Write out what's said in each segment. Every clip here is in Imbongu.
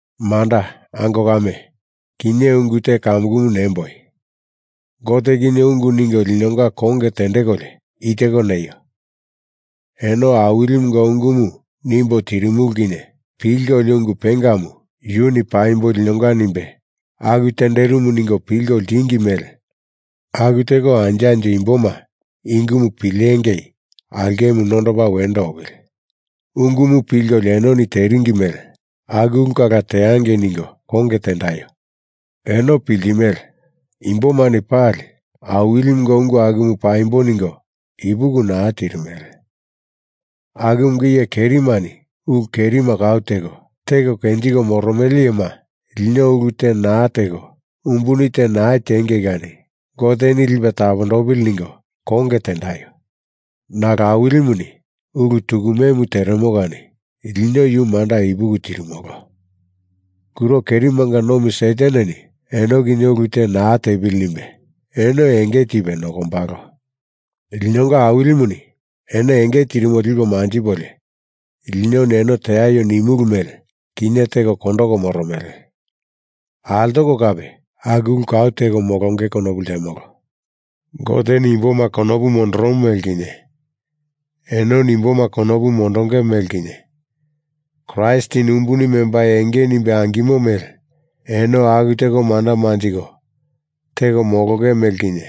Manda, ango kame, kinye ungu te kamukumu nemboi, Gote kinye ungu ningo linonga konge tendekolio i teko neio, eno Awilimunga ungumu nimbo tirimulu kinye pilkolio ungu pengamu, Yuni paimbo linonga nimbe aku tenderimu ningo pilko ltingi mele aku teko anjo anjo imboma i ungumu pilengei aulkemu nondopa wendo opili. Ungumu pilkolio enoni teringi mele aku ulu kala teangei ningo konge tendaio. Eno piltimele, imbomani pali Awilimunga ungu akumu paimbo ningo ipuki naa tirimele. Akumunga iye kerimani ulu kerima kau teko, teko kenjiko moromele iyema lino ulu te naa teko umbuni te naa tiengei kani Goteni lipe tapondopili ningo konge tendaio. Nalo Awilimuni ulu tukumemu teremo kani lino yu manda ipuki tirimolo. Kuro kerimanga nomi Sataneni eno kinye ulu te naa tepili nimbe eno enge tipe nokombalo. Linonga Awilimuni eno enge tirimo lipo manjipolio, linoni eno teaio nimulu mele kinye teko kondoko moromele, altoko kape aku ulu kau teko molonge konopu ltemolo. Goteni imboma konopu mondoromo mele kinye, enoni imboma konopu mondonge mele kinye, Kraistini umbuni membai enge nimbe angimo mele eno aku teko manda manjiko teko molonge mele kinye,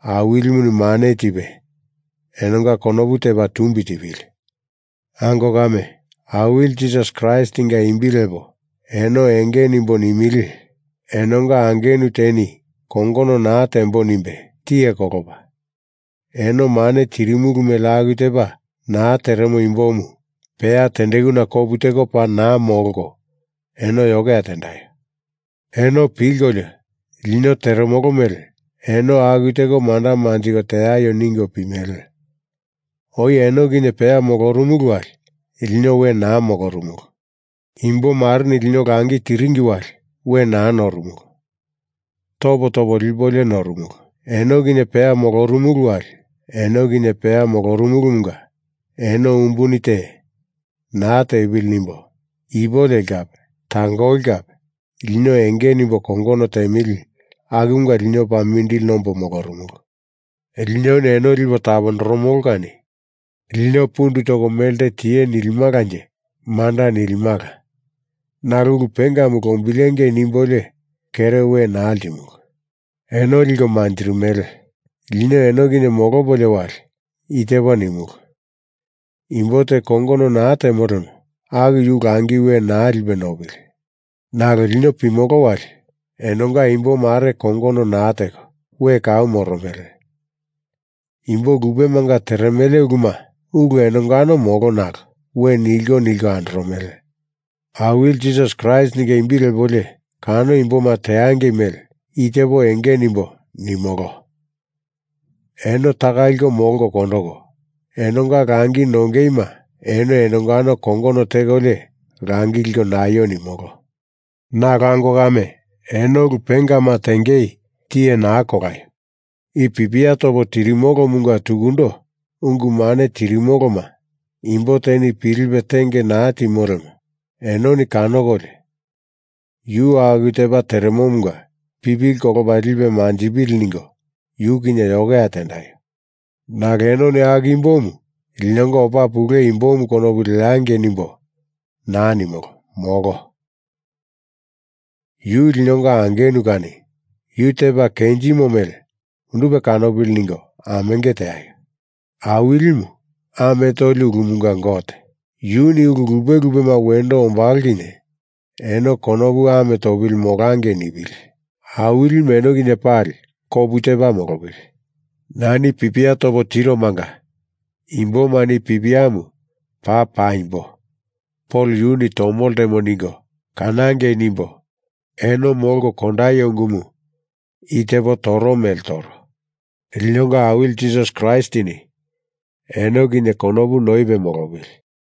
Awilimuni mane tipe enonga konopu tepa tumbi tipili. Ango kame, Awili Jisasi Kraistinga imbi lepo eno enge nimbo nimili, enonga angenu teni kongono naa tembo nimbe tiye kolopa, eno mane tirimulu mele aku tepa naa teremo imbomu peya tendekuna kopu teko paa naa molko eno yokeya tendaio! Eno pilkolio, lino teremolo mele eno aku teko manda manjiko teaio ningo pimele. Oi eno kinye peya molorumulu wali lino we naa molorumulu. Imbo mareni lino langi tiringi wali we naa norumulu. Topo topo lipolio norumulu. Eno kinye peya molorumulu wali eno kinye peya moromolomunga eno umbuni te naa tepili nimbo ipu leli kape tangoli kape lino enge nimbo kongono temili akumunga lino paa mindili nombo molorumulu. Linoni eno lipo tapondoromolo kani lino pundu toko melte tie nilimalanje manda nilimala. Nalo ulu pengamu lombilengei nimbolio kere we naa ltimulu. Eno liko manjirimele. Lino eno kinye molopolio wali i tepa nimulu, imbo te kongono naa temo lemo aku yu langi we naa lipe nopili! Nalo lino pimolo wali enonga imbomare kongono naa teko we kau moromele. Imbo lupemanga teremele uluma ulu enongano molo nalo we nilko nilko andoromele. Awili Jisasi Kraistinga imbi lepolio kano imboma teangei mele i tepo enge nimbo nimolo. Eno taka liko molko kondoko, enonga langi nongeima eno enongano kongono tekolio langi liko naio nimolo. Nalo ango kame, eno ulu pengama tengei tiye naa kolaio! I pipia topo tirimolomunga tukundo ungu mane tirimoloma imbo teni pilipe tenge naa timo lemo enoni kanokolio yu aku tepa teremomunga pipili kolopa lipe manjipili ningo yu kinye yokeya tendaio. Nalo enoni aku imbomu linonga opa pule imbomu konopu leangei nimbo naa nimolo, molo. Yu linonga angenu kani yu tepa kenjimo mele undupe kanopili ningo amenge teaio. Awilimu, ame toli ulumunga Gote, yuni ulu lupe lupema wendo ombalo kinye eno konopu ame topili molangei nipili. Awilimu eno kinye pali kopu tepa molopili. Nani pipia topo tiromanga imbomani i pipiamu paa paimbo Pol yunu tomo ltemo ningo kanangei nimbo eno molko kondaio ungumu i tepo toro mele toro. Linonga Awili Jisasi Kraistini eno kinye konopu noipe molopili.